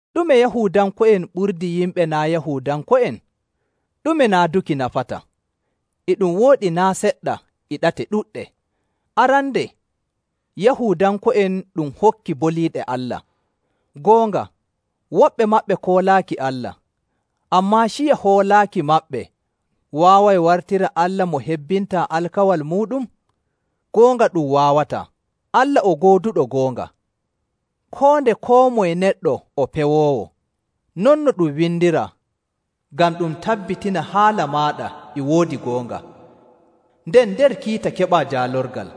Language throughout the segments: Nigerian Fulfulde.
Ɗume Yahuudanko'en ɓurdi yimɓe naa' Yahuudanko'en? Ɗume naaduki nafata? E ɗum wooɗi naa' seɗɗa e ɗate ɗuɗɗe. Arande, Yahuudanko'en ɗum hokki boliiɗe Allah. Goonga, woɓɓe maɓɓe koolaaki Allah. Ammaa ciya hoolaaki maɓɓe waaway wartira Allah mo hebbintaa alkawal muuɗum? Goonga ɗum waawataa! Allah o gooduɗo goonga, koo nde koo moye neɗɗo o pewoowo. Non no ɗum windiraa, “Ngam ɗum tabbitina haala maaɗa e woodi goonga, nden nder kiita keɓaa jaalorgal.”.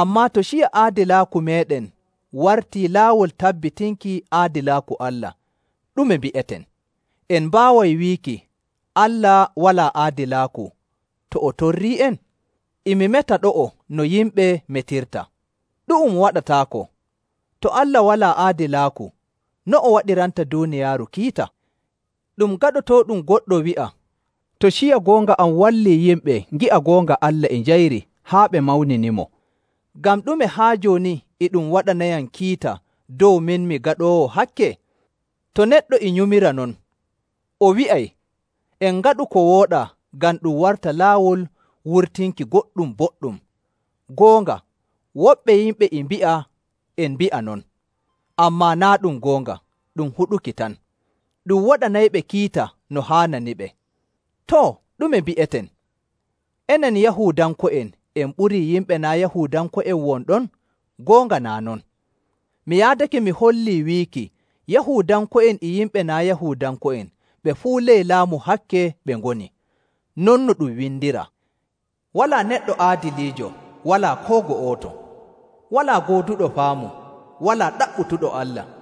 Ammaa to ciya aadilaaku meeɗen wartii laawol tabbitinki aadilaaku Allah, ɗume mbi'eten? En mbaaway wiiki Allah walaa aadilaaku to o torrii'en? (E mi meta ɗo'o no yimɓe metirta.) Ɗu'um waɗataako! To Allah walaa aadilaaku, no o waɗiranta duuniyaaru kiita? Ɗum gaɗotooɗum goɗɗo wi'a, “To ciya goonga am wallii yimɓe ngi'a goonga Allah e njayri haa ɓe mawninimo, ngam ɗume haa jooni e ɗum waɗanayam kiita dow min mi gaɗoowo hakke?” To neɗɗo e nyumira non, o wi'ay, “En ngaɗu ko wooɗaa ngam ɗum warta laawol wurtinki goɗɗum boɗɗum.” Goonga, woɓɓe yimɓe e mbi'a en mbi'a non, ammaa naa' ɗum goonga, ɗum huɗuki tan. Ɗum waɗanayɓe kiita no haananiɓe. Too, ɗume mbi'eten? Enen Yahuudanko'en en ɓurii yimɓe naa' Yahuudanko'en won ɗon? Goonga naa' non. Mi yaadake mi hollii wiiki Yahuudanko'en e yimɓe naa' Yahuudanko'en ɓe fuu ley laamu hakke ɓe ngoni. Non no ɗum windiraa, “Walaa neɗɗo aadiliijo, walaa koo go'oto, walaa gooduɗo faamu, walaa ɗaɓɓutuɗo Allah.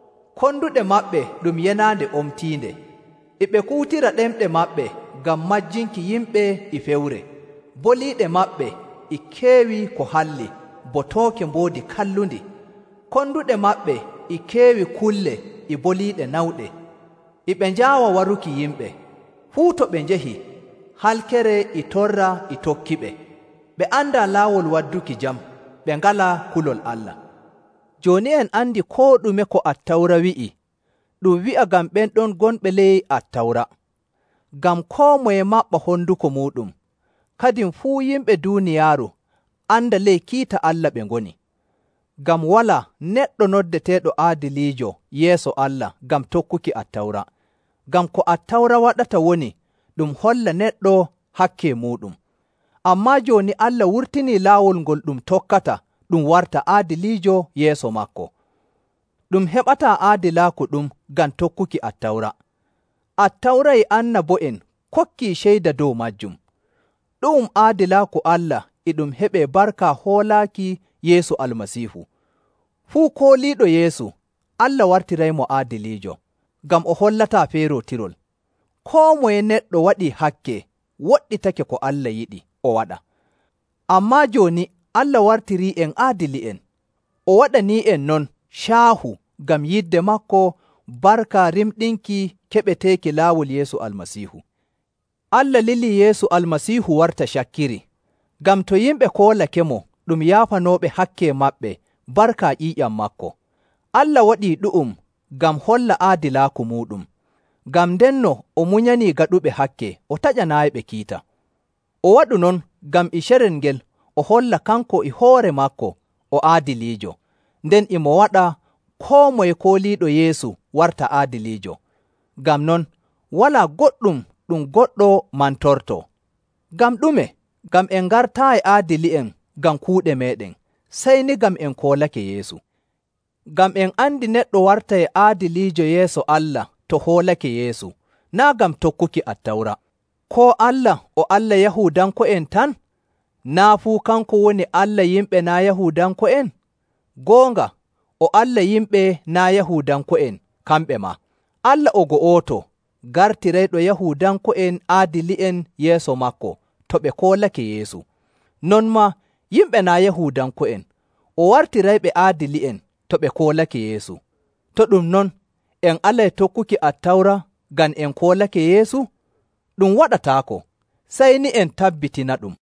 Konduɗe maɓɓe ɗum yenaande omtiinde. E ɓe kuutira ɗemɗe maɓɓe ngam majjinki yimɓe e fewre. Boliiɗe: Waato tondi. maɓɓe e keewi ko halli bo tooke mboodi kallundi.. Konduɗe maɓɓe e keewi kulle e boliiɗe nawɗe.. E ɓe njaawa waruki yimɓe. Fuu to ɓe njahi, halkere e torra e tokkiɓe. Ɓe andaa laawol wadduki jam.. Ɓe ngalaa kulol Allah.”. Jooni en andi koo ɗume ko Attawra wi'i, ɗum wi'a ngam ɓen ɗon gonɓe ley Attawra, ngam koo moye maɓɓa honduko muuɗum, kadin fuu yimɓe duuniyaaru anda ley kiita Allah ɓe ngoni. Ngam walaa neɗɗo noddeteeɗo aadiliijo yeeso Allah ngam tokkuki Attawra, ngam ko Attawra waɗata woni ɗum holla neɗɗo hakke muuɗum.. Ammaa jooni Allah wurtinii laawol ngol ɗum tokkata ɗum warta aadiliijo yeeso maako. Ɗum heɓataa aadilaaku ɗum ngam tokkuki Attawra. Attawra e annabo'en kokkii ceyda dow maajum. Ɗu'um aadilaaku Allah e ɗum heɓee barka hoolaaki Yeesu Almasiihu. Fuu kooliiɗo Yeesu, Allah wartiraymo aadiliijo, ngam o hollataa feerootirol.. Koo moye neɗɗo waɗi hakke woɗɗitake ko Allah yiɗi o waɗa. Ammaa jooni Allah wartirii'en aadili'en. O waɗanii'en non caahu ngam yidde maako barka rimɗinki keɓeteeki laawol Yeesu Almasiihu. Allah lilii Yeesu Almasiihu warta cakkiri, ngam to yimɓe koolakemo ɗum yaafanooɓe hakke maɓɓe barka ƴiiƴam maako. Allah waɗii ɗu'um ngam holla aadilaaku muuɗum. Ngam ndenno o munyanii gaɗuɓe hakke o taƴanaayiɓe kiita. O waɗu non ngam e carel ngel o holla kanko e hoore maako o aadiliijo, nden e mo waɗa koo moye kooliiɗo Yeesu warta aadiliijo. Ngam non, walaa goɗɗum ɗum goɗɗo mantortoo. Ngam ɗume? Ngam en ngartaayi aadili'en ngam kuuɗe meeɗen, sey ni ngam en koolake Yeesu. Ngam en andi neɗɗo wartay aadiliijo yeeso Allah to hoolake Yeesu, naa' ngam tokkuki Attawra. Koo Allah o Allah Yahuudanko'en tan? Naa' fuu kanko woni Allah yimɓe naa' Yahuudanko'en? Goonga, o Allah yimɓe naa' Yahuudanko'en, kamɓe maa. Allah o go'oto, gartirayɗo Yahuudanko'en aadili'en yeeso maako to ɓe koolake Yeesu. Non maa yimɓe naa' Yahuudanko'en, o wartirayɓe aadili'en to ɓe koolake Yeesu.. To ɗum non, en alay tokkuki Attawra ngam en koolake Yeesu? Ɗum waɗataako! Sey ni, en tabbitinaɗum.